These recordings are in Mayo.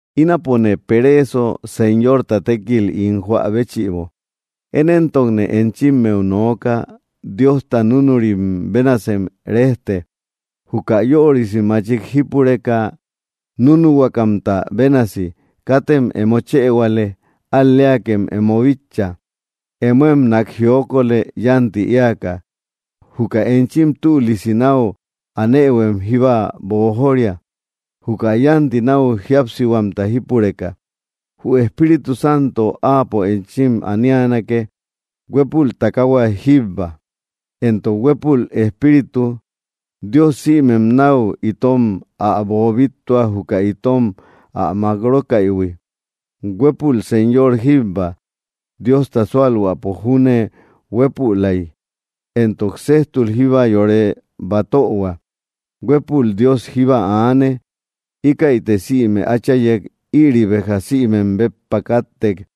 Ínapone pereeso, Señorta tékil ín joä béchïbo. Én éntokne enchimmeu nooka: Diosta núnurim bénasem rejte, juka yörisi machik jípureka núnuhuakamta bénasi. Katem emo chëhuale; al‑leakem emo bitcha; emoem nák jiokolë, yánti éaka. Juka enchim tülisi náu anëhuem jíba boojoria, juka yánti náu jíapsihuamta jípureka. Jü Espíritu Santo Áapo enchim anianake. Huépul takaahua jíbba, entok huépul Espíritu. Dios sïmem náu itom ä boobittua, juka itom ä mákrókaïhui. Huépul Señor jíbba, Diosta súalhuäpo júne huépülay, entok séjtul jíba yore batöhua. Huépul Dios jíba aane íkäite sïme áchayek. Ïri béja sïmem béppa káttek,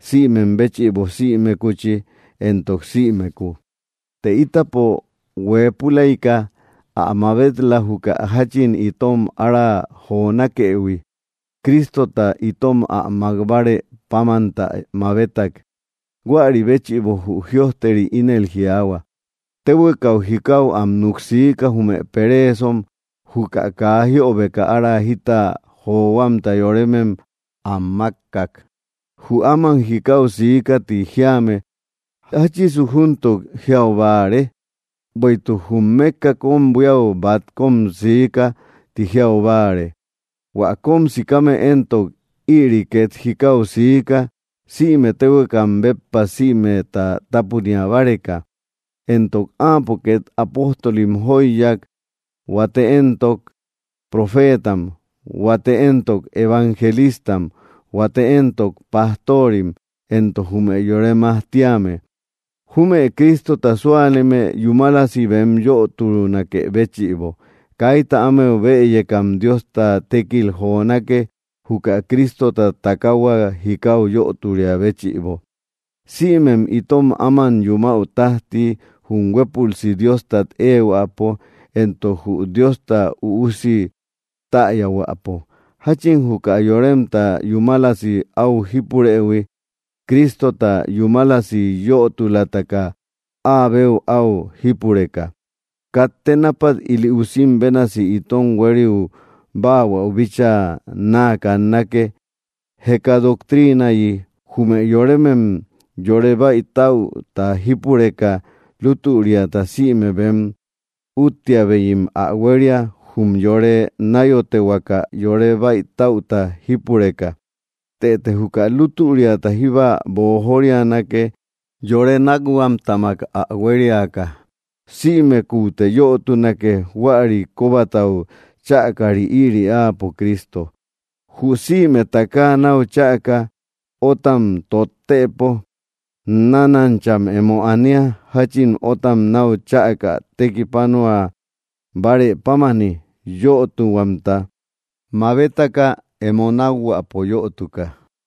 sïmem béchïbo, sïmekuchi entok sïmekuu. Të ítapo huëpulayka ä mabet‑la, juka jáchin itom ára jonakëhui; Cristota itom ä mák bárë pámantä mabetak. Huäri béchïbo jü jïojteri ínel jiaahua: Téhuekau jikau am núk siika, jume pereesom; juka kaa jiöbeka ára jita johuamta yoremem am mákkak. ¿Jü áman “jikau sika” ti jíame, jáchisu júntuk jiau báare? Bueïtuk jum mékka kóm buíau bat kóm siika ti jiau báare. Huä kóm sikame éntok, ïri két jikau siika, sïme téhuekam béppa, sïmeta tápunia báreka. Entok Áapo két apóstolim jóiyak; huate éntok, profeetam; huate éntok, evangelistam; huate éntok, pastoorim, entok jume yore majtíame, jume Cristota súaleme yúmalasi bem yötunakë béchïbo. Kaita ámeu bëyekam Diosta tékil jonake, juka Cristota takaahua jikau yöturia béchïbo, sïmem itom áman yumäu tájti, jum huépülsi Diostat éehuäpo, entok jü Diosta Üusi täyahuäpo, jáchin juka yoremta yúmalasi áu jípurëhui, Cristota yúmalasi yötulataka áa beu áu jípureka. Katte nápat ili usim bénasi itom huériu báahuäu bíchaa náa kannake, jeka doctriinayi, jume yoremem yore bäitäuta jípureka, lútüriata sïme bem úttiabeyim ä huéria, jum yore náyotehuaka yore bäitäuta jípureka. Tëte juka lútüriata jíba boojorianake, yore nákhuamtamak ä huériaka. Sïmekuute yötunake, huäri kóbatau chäkari; ïri Áapo Cristo. Jü sïme takaa náu cháaka, ótam tottëpo, nánancham emo ania, jáchin ótam náu chäka tekipanua bárë pámani, yötuhuamta mabetaka, emo nákhuäpo yötuka.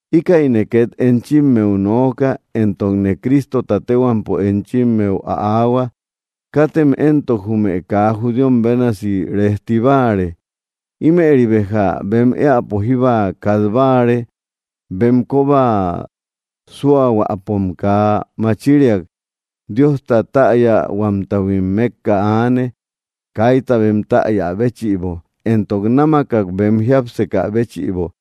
Íkäine két enchimmeu nooka, entokne Cristota téhuampo enchimmeu ä aahua: Katem éntok jume kaa judíom bénasi rejti báare. Ímëri béja bem éäpo jíba kat báare. Bem kóba súahuäpom kaa machiriak. Diosta täyahuamtahuim mékka aane, kaita bem täya béchïbo, entok námakak bem jiápsekä béchïbo.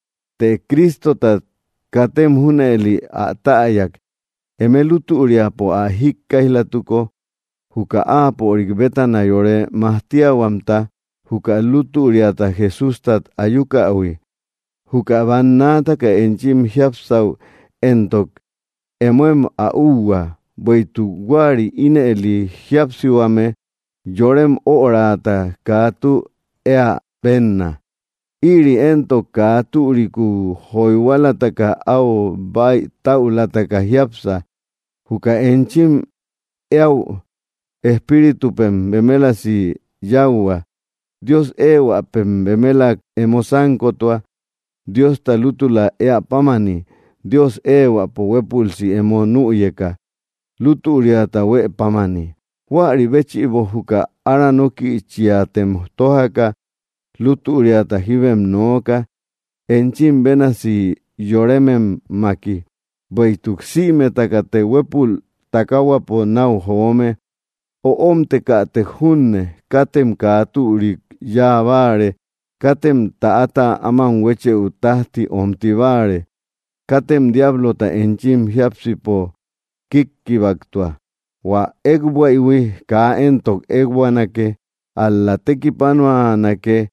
Të Cristotat katem junëli ä täyak, eme lútüriapo ä jíkkaïj‑latuko, juka Áapörik bétana yore majtiahuamta, juka lútüriata Jesústat ayukähui. Juka bannaataka enchim jiapsäu éntok, emoem ä úhua, bueïtuk huäri ínëli jíapsihuame yorem öraata kaa tü éä bénna. Ïri éntok kaa türikuu joyhualataka áu bäitäulataka jiápsa. Juka enchim éäu espíritupem bemelasi yáuhua. Dios éehuäpem bemelak emo sánkotua, Diosta lútula éä pámani, Dios éehuäpo huépülsi emo nüyeka, lútüriata huë pámani. Huäri béchïbo, juka aranókïchiatem tójaka, lútüriata jíbem nooka, enchim bénasi yorememmaki, bueïtuk sïmetakate huépul takaahuapo náu joome. Öomtekätek junne, katem kaa türik yáa báare. Katem täata áman huéchëu tájti omti báare. Katem diablota enchim jiápsipo kíkkibaktua. Huä ékbuaïhui kaa éntok ékbuanake, ál‑la tekipanuanake,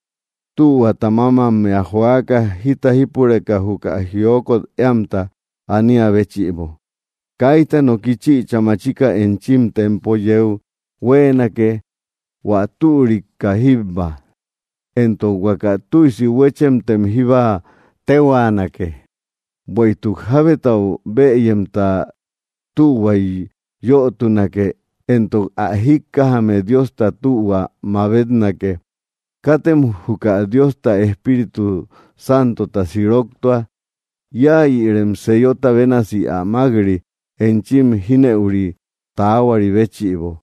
tühuata mámammea joaka, jita jípureka juka jiokot éamta aniä béchïbo. Kaita noki chïcha machika enchim tempo yeu huéenake, hua türika jíbba, entok huaka tüisi huéchemtem jíba téhuaanake. Bueïtuk jábetau bëyemta tühuay yötunake, entok ä jíkkajame Diosta tühua mabetnake. Katem juka Diosta Espíritu Santota siroktua, íayïrem sellota bénasi ä mák‑ri, enchim jínëuri taahuari béchïbo.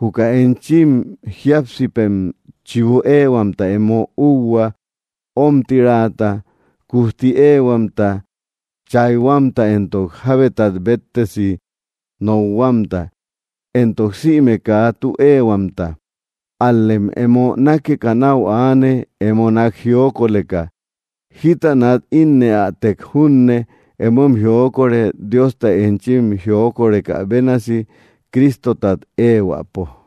Juka enchim jíapsipem chibu éehuamta emo úhua, ómtiraata, kujti éehuamta, chayhuamta entok jábetat béttesi nokhuamta, entok sïme kaa tü éehuamta. Ál‑lem emo nákeka náu aane, emo nák jiokoleka. Jíta nat ínnëatek junne, emoem jiokore, Diosta enchim jiokorekä bénasi, Cristotat éehuäpo.